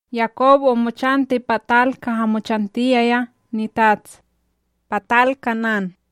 Yakob omochanti pa tal kaha mochantiyaya nitats, pa tal Kanán.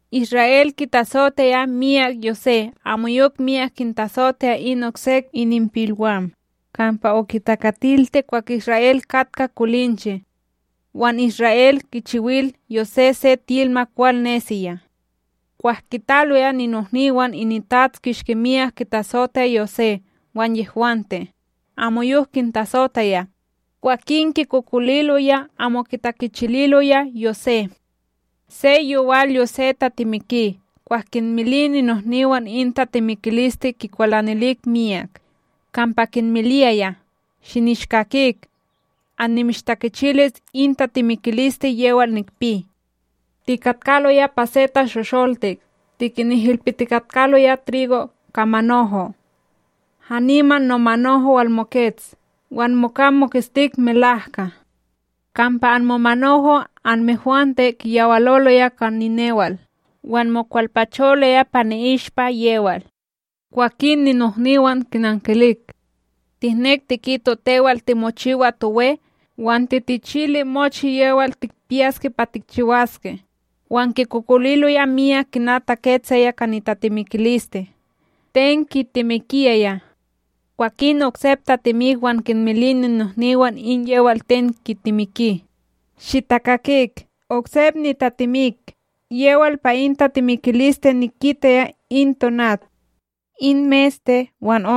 Isra'El kitasotaya miyak Yosé amoyok miyak kintasotaya in oksek ininpilwam, kampa okitakatilti kwah Isra'El katka kolinche. Wan Isra'El kichiwil Yosé se tilma kwal nesiya. Kwah kitaloya ninohniwan itats kishki miyak kitasotaya Yosé wan yehwante amoyok kintasotaya, kwakin kikokoliloya amo kitakichililoya Yosé. Se yowal Yosé tatemiki, kwah kinmili ninohniwan in tatemikiliste, kikwalanilik miyak, kampa kinmiliyaya: ―Shinishkakik, annimishtakichilis in tatemikiliste yewal nikpi. Tikatkaloya pa se tashosholtik tikinihilpitikatkaloya trigo ka manoho. Haniman nomanoho walmokets wan moka moketstik melahka, kampa anmomanoho' anmehwante kiyawaloloya ka ninewal wan mokwalpacholoya pa ni'ishpa yewal. Kwakin ninohniwan kinankilik: ―Tihnek tikito tewal timochiwas towe, wan titichili mochi yewal tikpiyaske pa tikchiwaske? Wan kikokoliloya miyak kina taketsaya ka nitatemikiliste ten kitemikiyaya. Kwakin oksep tatemik, wan kinmili ninohniwan in yewal ten kitemiki: ―Shitakakik oksep nitatemik, yewal pa in tatemikiliste nikitaya in tonat, in meste wan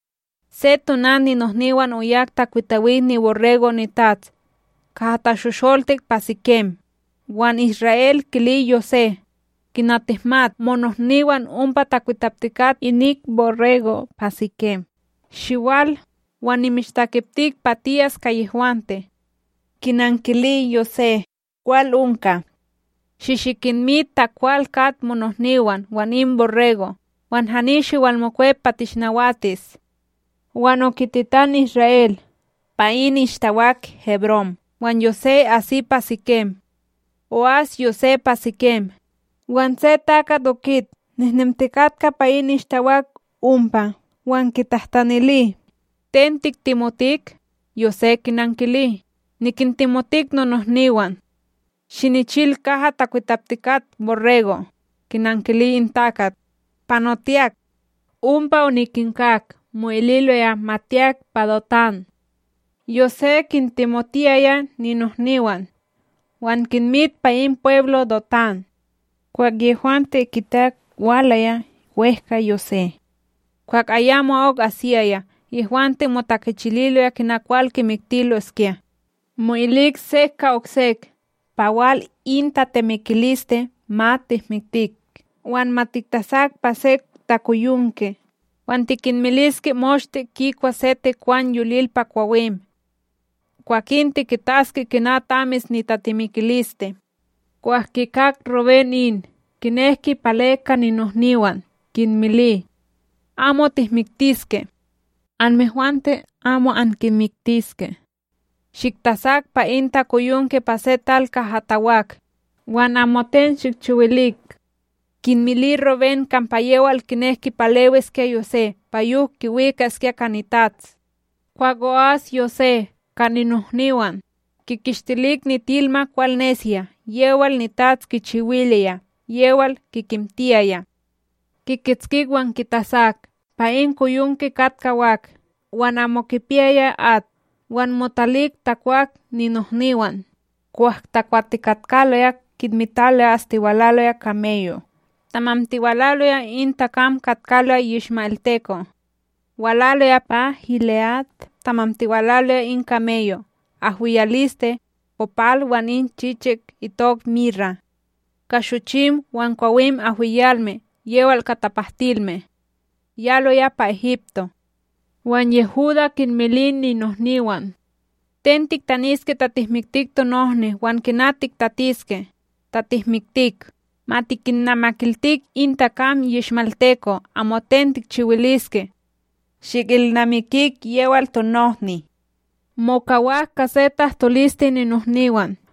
Se tonat, ninohniwan oyak takwitawik niborrego' nitats kaha tashosholtik pa Sikem. Wan Isra'El kili Yosé: ―Kina tihmat, monohniwan ompa takwitaptikat inik borrego' pa Sikem. Shiwal, wan nimishtakeptik pa tiyas ka yehwante. Kinankili Yosé: ―Kwal onka. ―Shi shikinmit ta kwal kat monohniwan wan in borrego' wan hani shiwalmokwep pa tinishnawatis. Wan okitetan Isra'El pa in ishtawak Hebron, wan Yosé asi pa Sikem. O'as Yosé pa Sikem, wan se takat okit nehnemtikatka pa in ishtawak ompa wan kitahtinili: ―Ten tiktemotik? Yosé kinankili: ―Nikintemotik nonohniwan. Shinichil kaha takwitaptikat borrego'? Kinankili in takat: ―Panotiyak. Ompa onikinkak mo'ililoya ma tiyak pa Dotán. Yosé kintemotiyaya ninohniwan, wan kinmit pa in pweblo Dotán. Kwah yehwante kitak walaya wEhka Yosé, kwah ayamo'ok asiyaya yehwante motakichililoya kina kwal kimiktiloskya. Mo'ilik sek ka oksek: ―Pa wal in tatemikiliste. Ma tihmiktik wan ma tiktasak pa se takoyonke, wan tikinmiliske moshte kikwa se tekwan yolil pa kwawim. Kwakin tikitaske kina tamis nitatemikiliste! Kwah kikak Ruben in, kinek kipale ka ninohniwam, kinmili: ―Amo tihmiktiske. Anmehwante amo ankimiktiske. Shiktasak pa in takoyonke pa se tal kaha tawak, wan amoten shikchiwilik. Kinmili Rubén kampa yewal kinek kipalewiskya Yosé pa yok kiwikaskya ka nitats. Kwah o'as Yosé ka ninohniwan, kikishtilik nitilma kwal nesiya yewal nitats kichiwiliya yewal kikimtiyaya, kikitskik wan kitasak pa in koyonke katka wak wan amo kipiyaya at. Wan motalik tawak ninohniwan. Kwah takwatikatkaloya kinmitaloya astiwalaloya kameyo' tamantiwalaloya in takam katkaloya yishma'elteko' walaloya pa Gile'ad. Tamantiwalaloya in kameyo' ahwiyaliste, kopal wan in chichik itok mira ka shochim wan kwawin ahwiyalme yewal ka tapahtilme, yaloya pa Egipto. Wan Yehudá kinmili ninohniwan: ―Ten tihtaniske ta tihmiktik tonohni wan kina tiktatiske, ta tihmiktik? Ma tikinnamakiltik in takam yishma'elteko'; amoten tikchiwiliske. Shikilnamikik yewal tonohni. Mokawak ka se tahtoliste ninohniwan,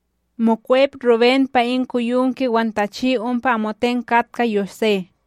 Mokwep Rubén pa in koyonke wan tachi ompa amoten katka Yosé,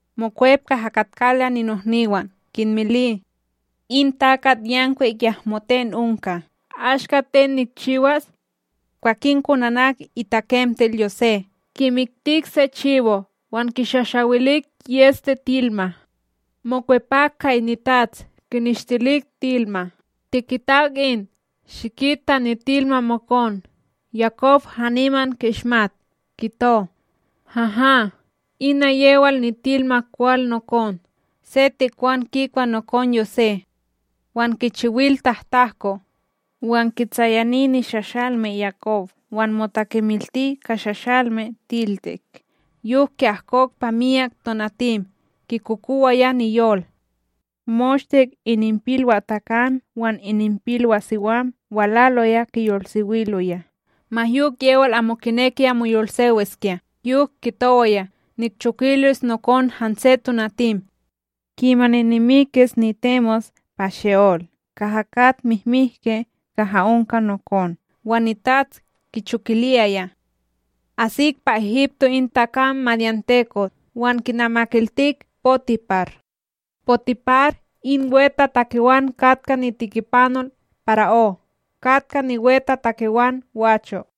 Mokwep kaha katkaloya ninohniwan, kinmili: ―In takatYankwik yahmo ten onka! Ashka ten nikchiwas? Kwakin konanak itakemtel Yosé, kimiktik se chibo, wan kishashawilik yEste tilma. Mokwepak ka itats kineshtilik tilma: “Tikitak in. Shikit ta nitilma mokon.” Yakobo haniman ki'ismat, kito: “Haha, ina yewal nitilma kwal nokon! Se tekwan kikwa nokon Yosé wan kichiwil tahtahko!” Wan kitsayani nishashalmeb Yakob wan motakemilti ka shashalme tiltik, yok ki'ahkok pa myak tonatim kikokowaya niyol. Moshte ininpilwaTakam wan ininpilwaSiwam walaloya kiyolsewiloya, ma yok yewal amo kinekiya moyolsewiskya yok kitowaya: “Nikchokilis nokon hanse tonatim, kimani nimikis nitemos pa She'olc kaha kat mimihke kaha onka nokon.” Wan nitats kichokiliyaya. Asik pa Egipto, in takam madyanteko' wan kinamakiltik Potipar, Potipar in wetatakewan katka nitikipanol para'ó katka niwetatakewan gwacho'.